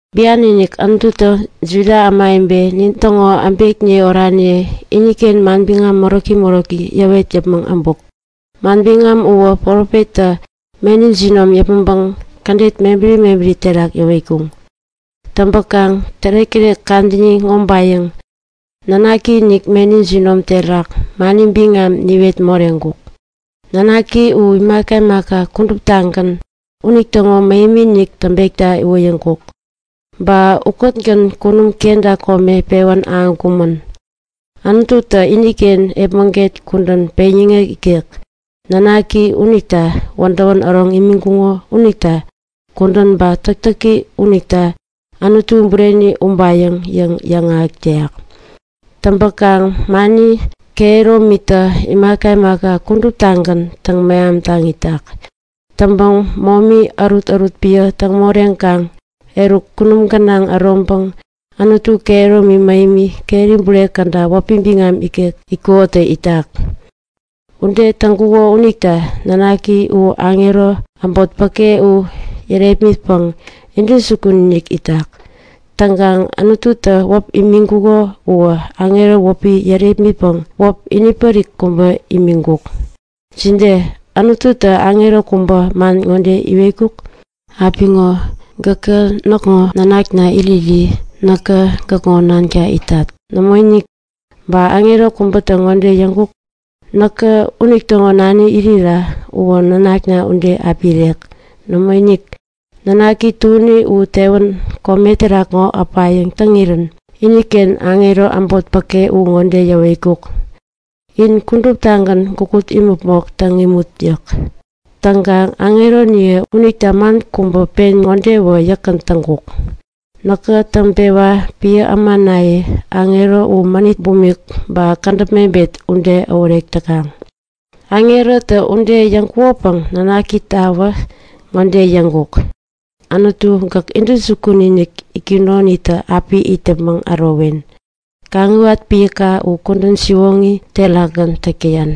Bian-inik Anututä Juda ämawebe nintäŋo äbekniye oraniye iniken manbiŋam moräki moräki yäwet yäpmäŋ äbuk. Manbiŋam uwä profettä meni jinom yäpmäŋpäŋ kädet mebäri mebäri terak yäwetkuŋ. Täŋpäkaŋ tärek-tärek kadäni ŋobayäŋ Nanaki-inik meni jinom terak mani biŋam niwet moreŋkuk. Nanaki u imaka imaka kuduptagän unitäŋo mähemi-inik täŋpekta iwoyäŋkuk. Ba ukätgän kunum kenta kome pewän ahäŋkumän. Anututä iniken epmäget kudän peŋyäŋek ikek, nanaki unita wädäwän äroŋ imiŋkuko unita kudän ba täktäki unitä Anutu bureni ubayäŋ yäŋ yäŋahäk täyak. Täŋpäkaŋ mani kehäromitä imaka imaka kuduptagän täŋ-mehamtaŋ itak. Täŋpäŋ momi ärutärut piä täŋ moreŋkaŋ eruk kunum gänaŋ äroŋpäŋ Anutu kehäromi mähemi keri bure käda wäpi biŋam ikek itkukonitä itak. Ude täŋkuko unita Nanaki u aŋero äbot päke uwä yärepmitpäŋ intäjukun-inik itak. Täŋkaŋ Anututä wäp imiŋkuko uwä aŋero wäpi yärepmitpäŋ wäp inipärik kubä imiŋkuk. Jide? Anututä aŋero kubä man ŋode iwetkuk? Apiŋo gäkä näkŋo nanakna iriri näkä gäkŋo nanka itat. Nämoinik! Ba aŋero kubäta ŋode yäŋkuk? Näkä unitäŋo nani irira uwä nanakna ude api irek. Nämoinik! Nanaki tuäni u tewän kome terak ŋo äpayäŋ täŋirän iniken aŋero äbot päke u ŋode yäwetkuk; In kuduptagän gukut imäpmok täŋ imut! yäk. Täŋkaŋ aŋeroniye unita man kubä pen ŋodewä yäkgän täŋkuk; Näkä täŋpewa piä ämanaye aŋero u mänit bumik, ba kädäp mebet ude äworek täkaŋ. Aŋerota ude yäŋkukopäŋ nanakitawä ŋode yäŋkuk; Anutu, gäk intäjukun-inik itkunoniktä api it yäpmäŋ ärowen. Kaŋiwat piäka u kudän siwoŋi terakgän täk täyan.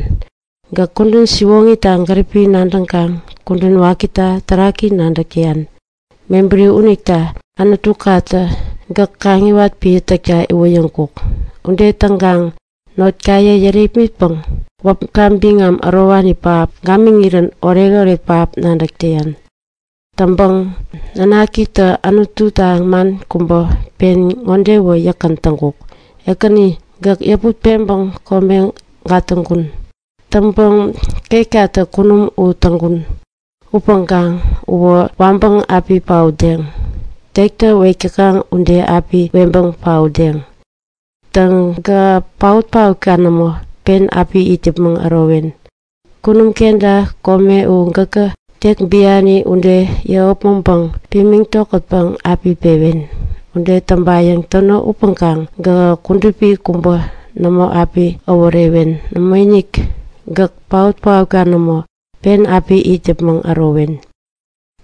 Gäk kudän siwoŋita gäripi nadäŋkaŋ kudän wakita taräki nadäk täyan. Mebäri unita Anutukatä gäk kaŋiwat piä täkta iwoyäŋkuk. Ude täŋkaŋ notkaye yärepmitpäŋ wäpka biŋam ärowani pähap gamiŋirän oretoret pähap nadäk täyan. Täŋpäŋ nanakita Anututä man kubä pen ŋodewä yäkgän täŋkuk; Ekäni, gäk yäput-peŋpäŋ kome gatäŋkun. Täŋpäŋ ketkatä kunum u täŋkun. Upäŋkaŋ uwä waŋpäŋ api paotdeŋ. Tektä wek täkaŋ ude api weŋpäŋ paotdeŋ. Täŋ, gähä paot-paotka nämo, pen api it yäpmäŋ ärowen. Kunum kenta kome u gäkä tek biani ude yäŋopmäŋpäŋ pimiŋ tokätpäŋ api pewen. Ude täŋpayäŋ täno upäŋkaŋ gähä kudupi kubä nämo api äworewen. Nämoinik, gäk paot-paotka nämo, pen api it yäpmäŋ ärowen.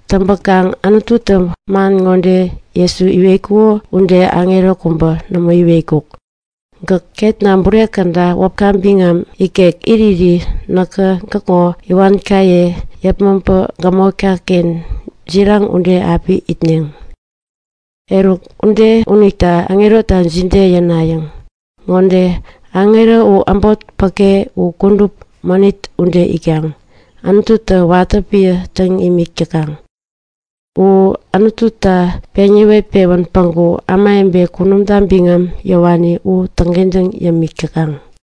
Täŋpäkaŋ Anututä Jesu man ŋode iwetkuko ude aŋero kubä nämo iwetkuk; Gäk ketna bure käda wäpka biŋam ikek iriri näkä gäkŋo iwankaye yepmaŋpa gämotka-ken jiraŋ ude api itneŋ. Eruk, ude unita aŋerota jide yänayäŋ? Ŋode; Aŋero u kudup mänit ude itkaŋ Anututa watä piä täŋ imik täkaŋ. U Anututä peŋ yäwet-pewän päŋku ämawebe kunumta biŋam yäwani u täŋkentäŋ yämik täkaŋ.